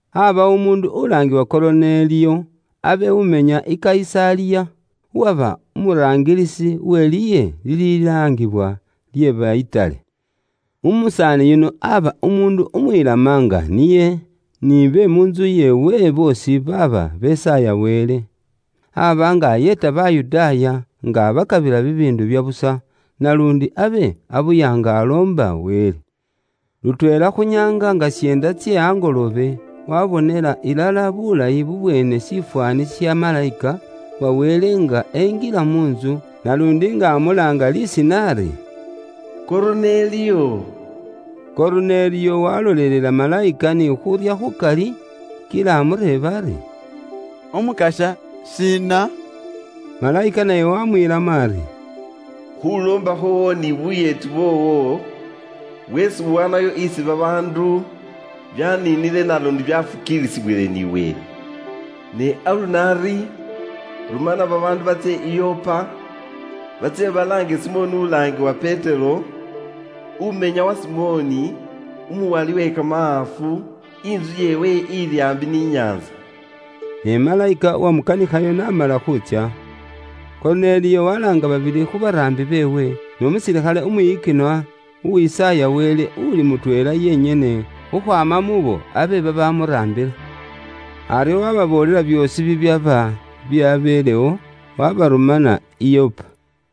Aabawo umuundu ulaangiwa Koruneliyo abe umenya i Kayisaliya, uwaba umuraangilisi uwe liye lililaangibwa lye ba Itali. Umusaani yuno aaba umuundu umwilama nga niye ni be mu ntsu yeewe boosi baaba besaaya Wele. Aaba nga ayeeta Bayudaaya nga abakabila bibiindu bya busa, naluundi abe abuya nga aloomba Wele. Lutweela khu nyaanga nga syeenda tse angoloobe, wabonela ilala bulayi bubweene shifwaani sha malayika wa Wele nga enjila mu ntsu naluundi nga amulaanga lisiina ari, “Koruneliyo.” Koruneliyo walolelela malayika ni khuurya khukali, kila amureeba ari “Umukasya, shiina?” Malayika naye waamwiilamo ari, “Khuuloomba khwoowo ni buyeeti bwoowo bweesi uwaanayo isi babaandu byaniinile naluundi byafukiilisibwile ni Wele. Ni aluno ari rumana babaandu batsye i Yopa, batsye balaange Simoni ulaangiwa Petero, umenya wa Simoni, uwala kamahaafu, intsu yeewe ili aambi ni nyaantsa.” Ne malayika uwamukanikhayo n'amala khuutsya, Koruneliyo walaanga babili khu baraambi beewe, n'umusilikhale umwiyikinwa uwisaaya Wele uli mutweela yenyene khukhwaama muubo abe babamuraambila. Aryo waababoolela byoosi bibyaba byabeelewo, waabarumana i Yopa.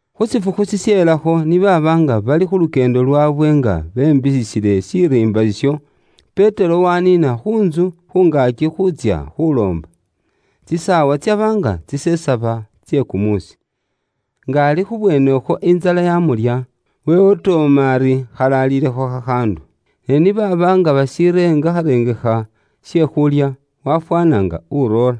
Khu shifukhu shisheelakho, ni baaba nga bali khu lukyeendo lwaabwe nga bembiiyisile shiriimba isho, Petero waaniina khu ntsu khu ngaaki khuutsya khuloomba. Tsisaawa tsaba nga tsisesaba tse kumuusi. Nga ali khubweenekhwo intsala yamulya, wewotooma ari khali aliilekho khakhaandu. Ne ni baaba nga bashirengakharengekha she khuulya, wafwaana nga uroora.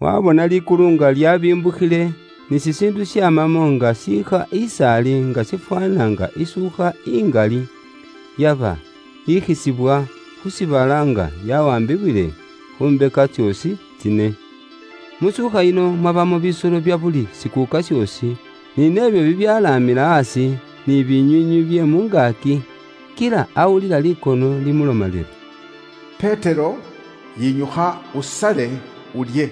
Waabona likulu nga lyaabimbukhile, ni shishiindu shaamamo nga shiikha is'ali nga shifwaana nga isuukha ingali, yaba yikhisibwa khu shiibala nga yawaambibwiile khu mbeka tsoosi tsine. Mu suukha yino mwabamo bisolo bya buli shikuuka shoosi, ni nebyo bibyalaamila aasi, ni binywiinywi bye mu ngaaki. Kila awulila likono limuloma liri, “Petero, yinyukha usale, ulye.”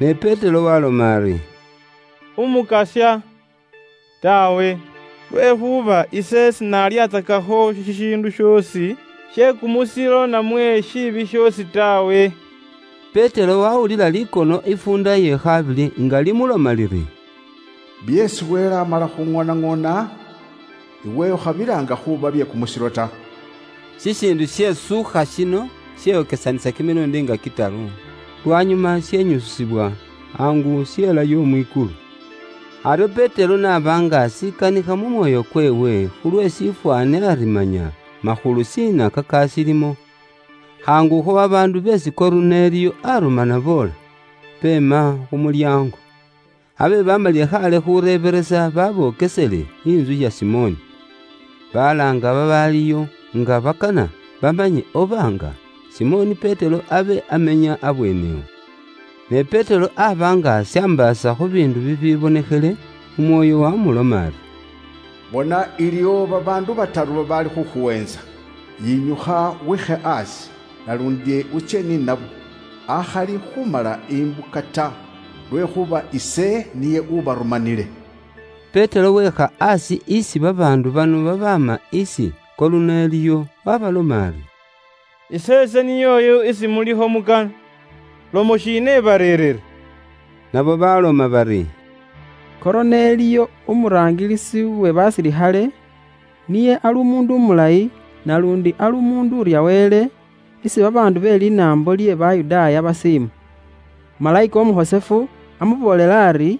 Ne Petero waaloma ari, “Umukasya, senyala nashikhola taawe. Lwekhuuba ise ishiili khulyatsakakho shishiindu shoosi she kumusilo namwe shikhali shipyeluuse ta.” Petero wawulila likono ifuunda ye khabili nga limuloma liri, “Byeesi Wele amala khuŋoonaŋoona, iwe ukhabilaanga khuuba bye kumusilo ta.” Shishiindu she suukha shino sheyokyesanisa kimiluundi nga kitaru, lwanyuma shenyusibwa khaangu shelayo mwikulu. Aryo Petero n'aba nga ashikanakana mu mwoyo kweewe khulwe shifwaani ari manya makhulu shiina kakashiilimo, khaangukho babaandu beesi Koruneliyo arumana boola, beema khu mulyaango. Abe bamalile khaale khureebelesa babokesele intsu ya Simoni. Balaanga babaaliyo nga bakana bamanye oba nga Simoni Petero abe amenya abweene awo. Ne Petero aaba nga ashambaasa khu biindu bibibonekhele, Umwoyo waamuloma ari, “Bona iliwo babaandu bataru babaali khukhuweentsa. Yinyukha wiikhe aasi, naluundi utsye ni nabo, akhali khumala imbuka ta, lwekhuuba ise niye ubarumanile.” Petero weekha aasi isi babaandu bano babaama isi Koruneliyo waabaloma ari, “Iseese niyooyu isi mulikho mukana. Lomo shiina ibareerire?” Nabo baaloma bari, “Koruneliyo umuraangilisi we basilikhale, niye ali umuundu umulayi naluundi ali umuundu urya Wele, isi babaandu be linaambo lye Bayudaaya basiima. Malayika Umukhosefu amuboolele ari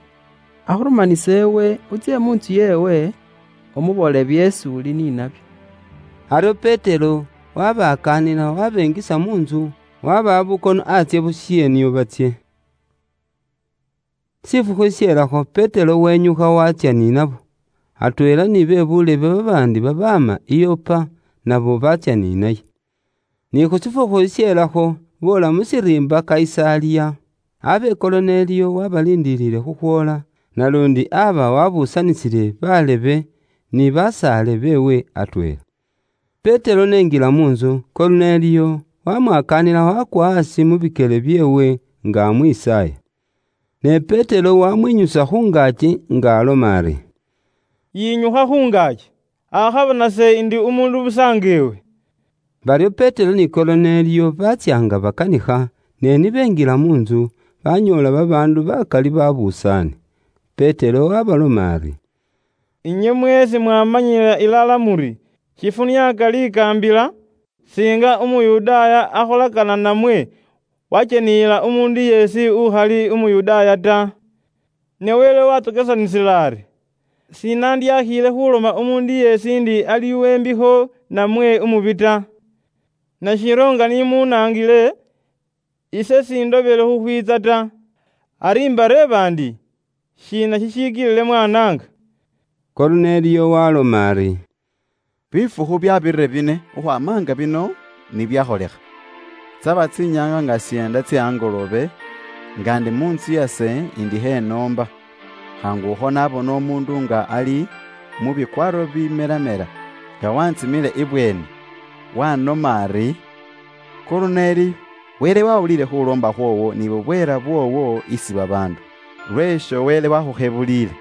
akhurumanise iwe utsye mu ntsu yeewe, umuboolele byeesi uli ni nabyo.” Aryo Petero wabakaanila wabenjisa mu ntsu, wabawa bukono antsye bushe nio batsye. Shifukhu shishelakho, Petero wenyukha watsya ni nabo, atweela ni be buulebe babaandi babaama i Yopa nabo batsya ni naye. Ni khu shifukhu shisheelakho, boola mu shiriimba Kayisaliya. Abe Koruneliyo waabaliindiliile khukhwoola, naluundi aba waabuusanisile baalebe ni basaale beewe atweela. Petero n'enjila mu ntsu, Koruneliyo wamwakaanila wakwa aasi mu bikyele byeewe nga amwisaaya. Ne Petero wamwinyusa khu ngaaki nga aloma ari, “Yinyukha khu ngaaki, akhaba nase indi umuundu busa nga iwe.” Baryo Petero ni Koruneliyo baatsya nga bakanikha, ne ni benjila mu ntsu, banyoola babaandu bakali babusaane. Petero waabaloma ari, “Inywe mweesi mwamanyila ilala muri, shifuniaaka likaambila singa Umuyudaaya akholakana namwe wakyeniyila umuundu yeesi uli umunaambo. Ne Wele wantsokesanisile ari, sinandyakhiile khuloma umuundu yeesi ndi ali uwe mbikho namwe umubi ta. Nashiryo nga ni munaangile, ise sindobile khukhwiitsa ta. Ari imbareeba ndi shiina shishikilile mwaanaanga?” Koruneliyo waaloma ari, “Bifukhu byabirire bine khukhwaama nga bino nibyakholikha: tsaba tsinyaanga nga syeenda tse angoloobe nga ndi mu ntsu yase indi mu khuloomba, khaangukho nabona umuundu nga ali mu bikwaaro bibimelamela nga wantsimile ibweeni. Wanoma ari, ‘Koruneliyo, Wele wawuliile khuloomba khwoowo ni bubweela bwoowo isi babaandu, lweesho Wele wakhukhebuliile.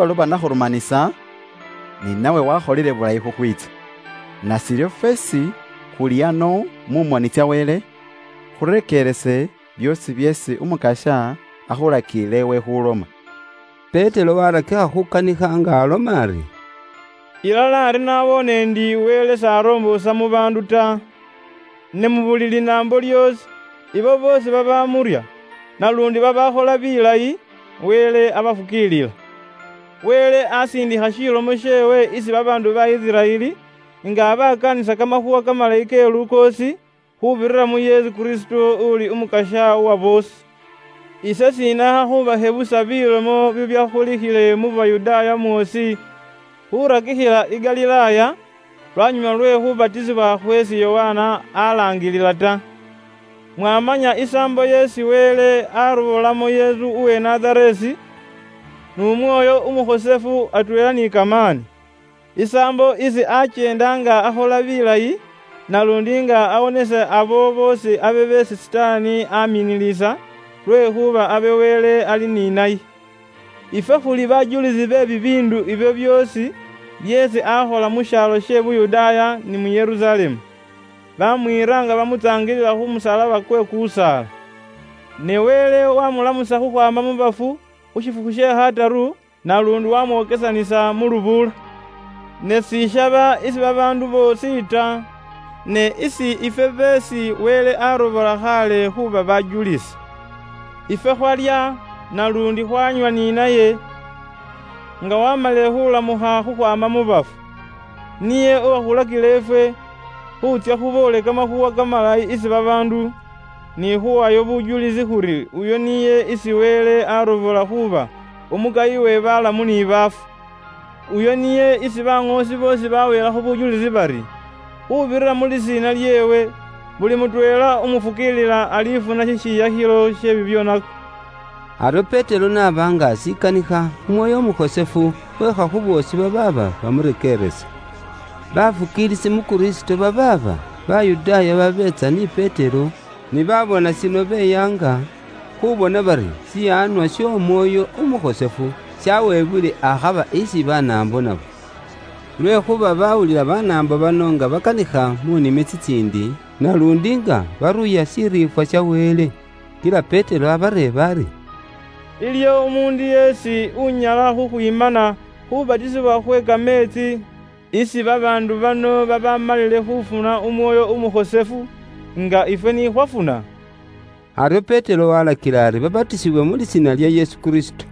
Nase lubaluba nakhurumanisa, ni nawe wakholile bulayi khukhwiitsa. Nashiryo fweesi khuli ano mu moni tsa Wele khurekeerese byoosi byeesi Umukasya akhulakiile iwe khuloma.” Petero waarakikha khukanikha nga aloma ari, “Mu ŋali ari ise naboone ndi Wele s'aromboosa mu baandu ta. Ne mu buli linaambo lyoosi ibo boosi babamurya naluundi babaakhola bilayi, Wele abafukiilila. Wele asiindikha shilomo sheewe isi babaandu ba Isiraeli nga abakaanisa kamakhuuwa kamalayi ke lukoosi khuubirira mu Yesu Kristo uli Umukasya wa boosi. Ise sinaakha khubakhebusa bilomo bibyakholikhile mu Yuda mwoosi khurakikhila i Galilaaya, lwanyuma lwe khubatisibwa khweesi Yokana alaangilila ta. Mwamanya isaambo yeesi Wele arobolamo Yesu uwe Nazareesi n'Umwoyo Umukhosefu atweela ni kamaani. Isaambo isi akyeenda nga akhola bilayi, naluundi nga awonisa abo boosi abe beesi Sitaani aminilisa, lwekhuuba abe Wele ali ni naye. Ifwe khuli bajulisi be bibiindu ibyo byoosi byeesi akhola mu shibala she Bayudaaya ni mu Yerusalemu. Bamwiira nga bamutsaangilila khu musalaba kwe kusaala. Ne Wele waamulamusa khukhwaama mu bafu khu shifukhu she khataru, naluundi waamwokesanisa mu lubuula. Ne sishaba isi babaandu boosi ta, ne isi ifwe beesi Wele aarobola khaale khuuba bajulisi. Ifwe khwalya naluundi khwanywa ni naye nga waamalile khulamukha khukhwaama mu bafu. Niye uwakhulakila ifwe khuutsya khuboole Kamakhuuwa Kamalayi isi babaandu, ni khuwayo bujulisi khuri uyo niye isi Wele arobola khuuba umukayi we balamu ni baafu. Uyo niye isi baŋoosi boosi baweelakho bujulisi bari, khuubirira mu lisiina lyeewe, buli mutweela umufukiilila alifuna shishiyakhilo she bibyoonako.” Aryo Petero n'aba nga ashikanikha, Umwoyo Umukhosefu weekha khu boosi babaaba bamurekeeresa. Bafukiilisi mu Kristo babaaba Bayudaaya babeetsa ni Petero ni baabona shino beyaanga, khubona bari shiwaanwa sh'Omwoyo Umukhosefu shaweebwile akhaba isi Banaambo nabo. Lwekhuuba bawulila Banaambo bano nga bakanikha mu nimi tsitsiindi, naluundi nga baruuya shiriifwa sha Wele. Kila Petero abareeba ari, “Iliyo umuundu yeesi unyala khukhwimana khubatisibwa khwe kameetsi isi babaandu bano babamalile khufuna Umwoyo Umukhosefu nga ifwe ni khwafuna?” Aryo Petero walakila ari babatisiwe mu lisiina lya Yesu Kristo.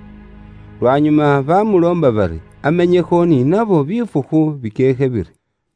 Lwanyuma bamuloomba bari amenyekho ni nabo bifukhu bikyeekhe biri.